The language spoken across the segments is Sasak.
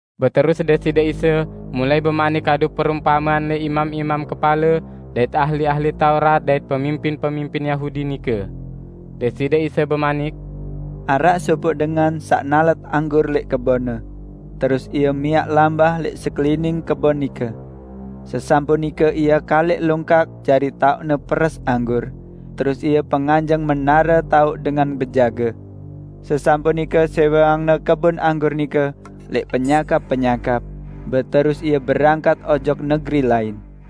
Beterus Deside Isa mulai bemanik kadu perumpamean lẽq imam-imam kepale dait ahli-ahli Taurat dait pemimpin-pemimpin Yahudi nike. Deside Isa bemanik, "Araq sopoq dengan saq nalet anggur lẽq kebonne. Terus ie miaq lambah lẽq sekelining kebon nike. Sesampun nike ie kaliq longkak jari taoqne peres anggur, terus ie penganjeng menare taoq dengan bejage. Sesampun nike sẽweangne kebon anggur nike lẽq penyakap-penyakap, beterus ie berangkat ojok negeri lain.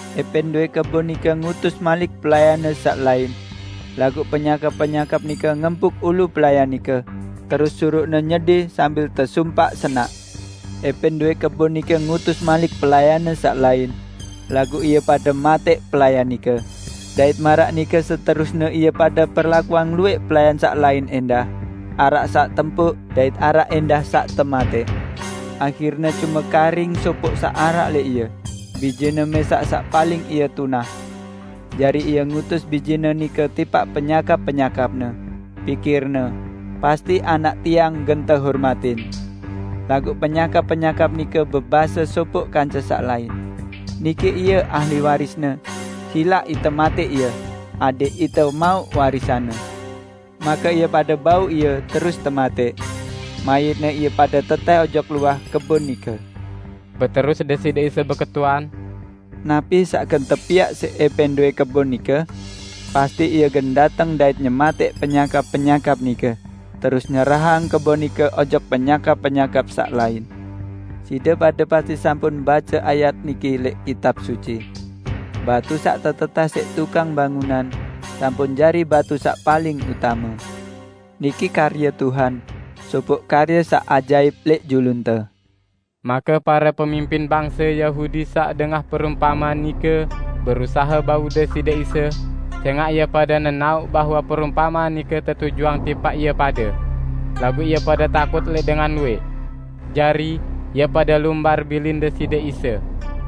~Epẽn dowẽ kebon nike ngutus malik pelayanne saq lain. Laguq penyakap-penyakap nike ngempuk ulu pelayan nike, terus suruqne nyedi sambil tesumpaq-senaq. ~Epẽn dowẽ kebon nike ngutus malik pelayanne saq lain. Laguq ie pade matẽq pelayan nike. Dait maraq nike seterusne ie pade perlakuang luwẽq pelayan saq lain ẽndah: araq saq tempuk dait araq ẽndah saq tematẽq. Ahirne cume karing sopoq saq araq lẽq ie, bijene mẽsaq saq paling ie tunah. Jari ie ngutus bijene nike tipaq penyakap-penyakapne. Pikirne, 'Pasti anak tiang gen tehormatin.' Laguq penyakap-penyakap nike bebase sopoq kance saq lain, 'Niki ie ahli warisne, silaq ite matẽq ie, adẽq ite mauq warisanne!' Make ie pade bau ie terus tematẽq. Mayitne ie pade tetẽh ojok luah kebon nike." Beterus Deside Isa beketuan, "Napi saq gen tepiaq siq ẽpẽn dowẽ kebon nike? Pasti ie gen dateng dait nyematẽq penyakap-penyakap nike, terus nyerahang kebon nike ojok penyakap-penyakap saq lain. Side pade pasti sampun bace ayat niki lẽq Kitab Suci, 'Batu saq tetetẽh siq tukang bangunan sampun jari batu saq paling utame. Niki karye Tuhan; sopoq karye saq ajaip lẽq julunte!' " Make pare pemimpin bangse Yahudi saq dengah perumpamean nike berusahe bau Deside Isa, sẽngaq ie pade nenaoq bahwe perumpamean nike tetujuang tipaq ie pade. Laguq ie pade takut lẽq dengan luwẽq. Jari, ie pade lumbar bilin Deside Isa.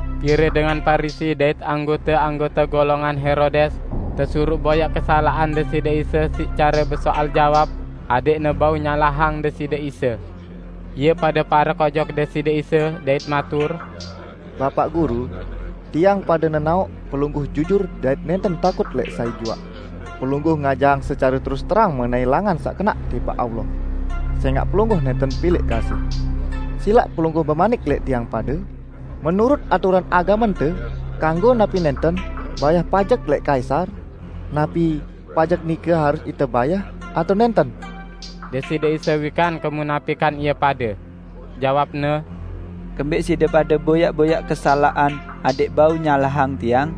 Pire dengan Parisi dait anggote-anggote golongan Herodes tesuruq boyaq kesalaqan Deside Isa siq care besoal jawab adẽqne bau nyalahang Deside Isa. Ie pade parek ojok Deside Isa dait matur, "Bapaq Guru, tiang pade nenaoq Pelungguh jujur dait nẽnten takut lẽq sai juaq. Pelungguh ngajahang secare terus terang mengenai langan saq kenaq tipaq Allah. Sẽngaq Pelungguh nẽnten pilẽq kasih. Silaq Pelungguh bemanik lẽq tiang pade, 'Menurut aturan agamente, kanggo napi nẽnten bayah pajek lẽq kaisar? Napi pajek nike harus ite bayah atao nẽnten?' " Deside Isa wikan kemunapikan ie pade. Jawab-Ne, "Kembẽq side pade boyaq-boyaq kesalaqan adẽq bau nyalahang Tiang?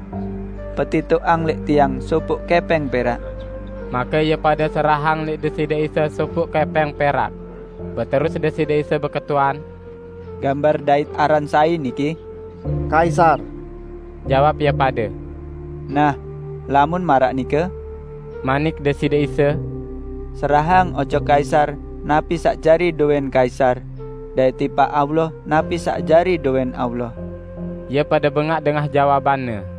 Petitoqang lẽq Tiang sopoq kẽpẽng perak." Make ie pade serahang lẽq Deside Isa sopoq kẽpẽng perak. Beterus Deside Isa beketuan, "Gambar dait aran sai niki?" "Kaisar," jawab ie pade. "Nah, lamun maraq nike," manik Deside Isa, "serahang ojok Kaisar napi saq jari dowẽn Kaisar, dait tipaq Allah napi saq jari dowẽn Allah." Ie pade bengaq dengah jawaban-Ne.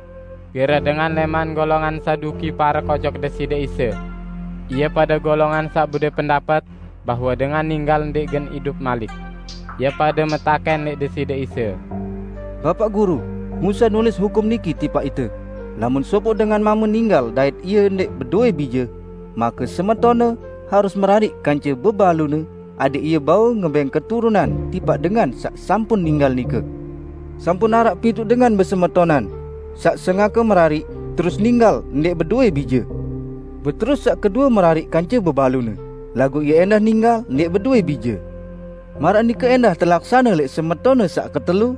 Pire dengan lẽman golongan Saduki parek ojok Deside Isa. (Ie pade golongan saq bedowẽ pendapet bahwe dengan ninggal ndẽq gen idup malik.) Ie pade metakẽn lẽq Deside Isa: "Bapaq Guru, Musa nulis hukum niki tipaq ite: 'Lamun sopoq dengan mame ninggal dait ie ndẽq bedowẽ bije, make semetonne harus merariq kance bebalune adẽq ie bau ngebẽng keturunan tipaq dengan saq sampun ninggal nike.' Sampun araq pituq dengan besemetonan. Saq sengake merariq, terus ninggal ndẽq bedowẽ bije. Beterus saq kedue merariq kance bebalune, laguq ie ẽndah ninggal ndẽq bedowẽ bije. Maraq nike ẽndah telaksane lẽq semetonne saq ketelu,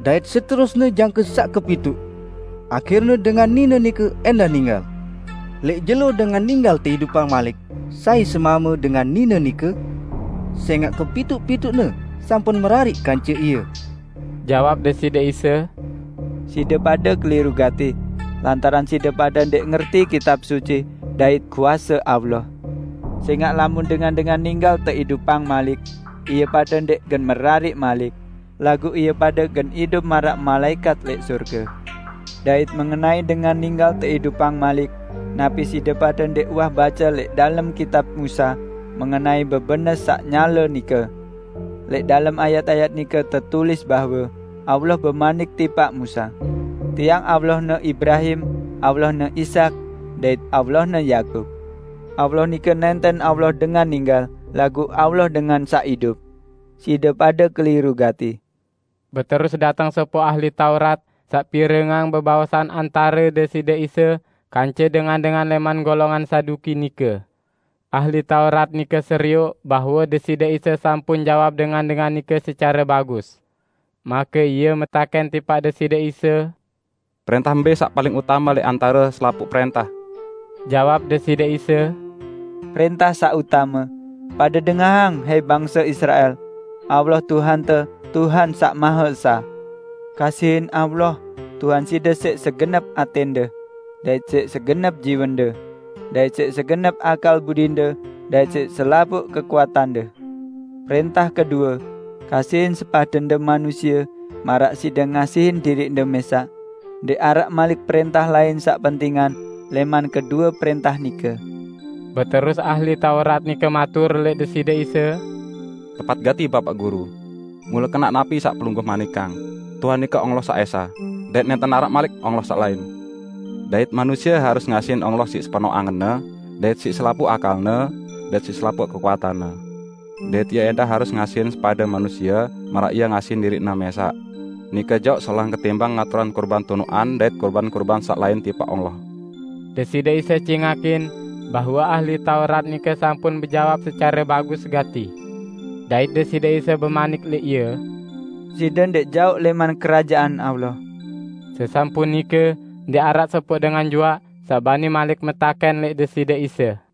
dait seterusne jangke saq kepituq. Ahirne dengan nine nike ẽndah ninggal. Lẽq jelo dengan ninggal teidupang malik, sai semame dengan nine nike? Sẽngaq kepituq-pituqne sampun merariq kance ie!" Jawab Deside Isa, "Side pade keliru gati, lantaran side pade ndẽq ngerti Kitab Suci dait kuase Allah. Sẽngaq lamun dengan-dengan ninggal teidupang malik, ie pade ndẽq gen merariq malik, laguq ie pade gen idup maraq malaẽkat lẽq sorge. Dait mengenai dengan ninggal teidupang malik, napi side pade ndẽq uwah bace lẽq dalem kitab Musa mengenai bebenes saq nyale nike? Lẽq dalem ayat-ayat nike tetulis bahwe Allah bemanik tipaq Musa, 'Tiang Allahne Ibrahim, Allahne Ishak dait Allahne Yakub.' Allah nike nẽnten Allah dengan ninggal, laguq Allah dengan saq idup. Side pade keliru gati!" Beterus dateng sopoq ahli Taurat saq pirengang bebaosan antare Deside Isa kance dengan-dengan lẽman golongan Saduki nike. Ahli Taurat nike serioq bahwe Deside Isa sampun jawab dengan-dengan nike secare bagus. Make ie metakẽn tipaq Deside Isa, "Prẽntah mbẽ saq paling utame lẽq antare selapuq prẽntah?" Jawab Deside Isa, "Prẽntah saq utame: 'Pade dengahang, hai bangse Israel! Allah, Tuhante, Tuhan Saq Mahe Esa! Kasihin Allah, Tuhan side siq segenep atẽnde, dait siq segenep jiwende dait siq segenep akal budinde dait siq selapuq kekuatande.' Prẽntah kedue: 'Kasihin sepadende manusie, maraq side ngasihin diriqde mẽsaq.' Ndẽq araq malik prẽntah lain saq pentingan lẽman kedue prẽntah nike." Beterus ahli Taurat nike matur lẽq Deside Isa, "Tepat gati, Bapaq Guru! Mule kenaq napi saq Pelungguh manikang: Tuhan nike Allah saq esa, dait nẽnten araq malik Allah saq lain. Dait manusie harus ngasihin Allah siq sepenoq angenne, dait siq selapuq akalne, dait siq selapuq kekuatanne. Dait ie ẽndah harus ngasihin sepade manusie maraq ie ngasihin diriqne mẽsaq. Nike jaoq solahan ketimbang ngaturang kurban tunuqan dait kurban-kurban saq lain tipaq Allah." Deside Isa cingakin bahwe ahli Taurat nike sampun bejawab secare bagus gati. Dait Deside Isa bemanik lẽq ie, "Side ndẽq jaoq lẽman Kerajaan Allah." Sesampun nike, ndẽq araq sopoq dengan juaq saq bani malik metakẽn lẽq Deside Isa.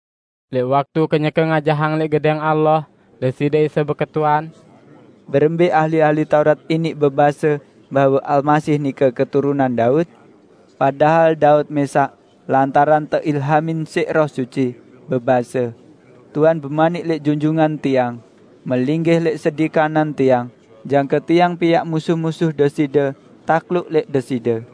Lẽq waktu kenyeke ngajahang lẽq Gedẽng Allah, Deside Isa beketuan, "Berembẽ ahli-ahli Taurat iniq bebase bahwe Almasih nike keturunan Daud? Padahal Daud mẽsaq -- lantaran teilhamin siq Roh Suci -- bebase, 'Tuhan bemanik lẽq Junjungan tiang: Melinggih lẽq sedi kanan Tiang, jangke Tiang piaq musuh-musuh Deside takluk lẽq Deside.'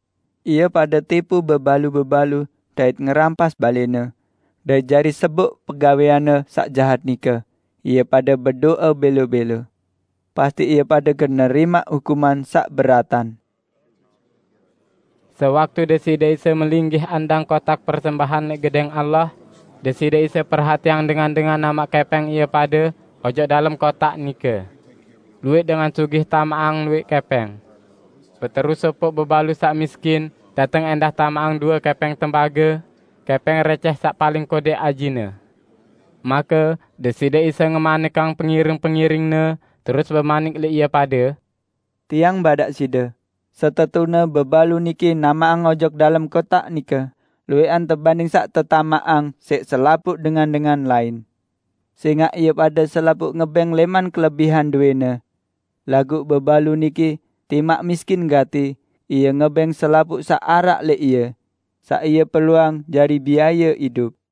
Ie pade tipu bebalu-bebalu dait ngerampas balẽne. Dait jari seboq pegawẽanne saq jahat nike, ie pade bedo'e bẽlo-bẽlo. Pasti ie pade gen nerimaq hukuman saq beratan!" Sewaktu Deside Isa melinggih andang kotaq persembahan lẽq Gedẽng Allah, Deside Isa perhatiang dengan-dengan namaq kẽpẽng ie pade ojok dalem kotaq nike. Luwẽq dengan sugih tamaqang luwẽq kẽpẽng. Beterus sopoq bebalu saq miskin dateng ẽndah tamaqang due kẽpẽng tembage, kẽpẽng rẽcẽh saq paling kodẽq ajine. Make Deside Isa ngemanikang pengiring-pengiring-Ne, terus bemanik lẽq ie pade, "Tiang badaq side: Setetune bebalu niki namaqang ojok dalem kotaq nike luwẽqan tebanding saq tetamaqang siq selapuq dengan-dengan lain. Sẽngaq ie pade selapuq ngebẽng lẽman kelebihan dowẽne. Laguq bebalu niki, timaq miskin gati, ie ngebẽng selapuq saq araq lẽq ie -- saq ie perluang jari biaye idup."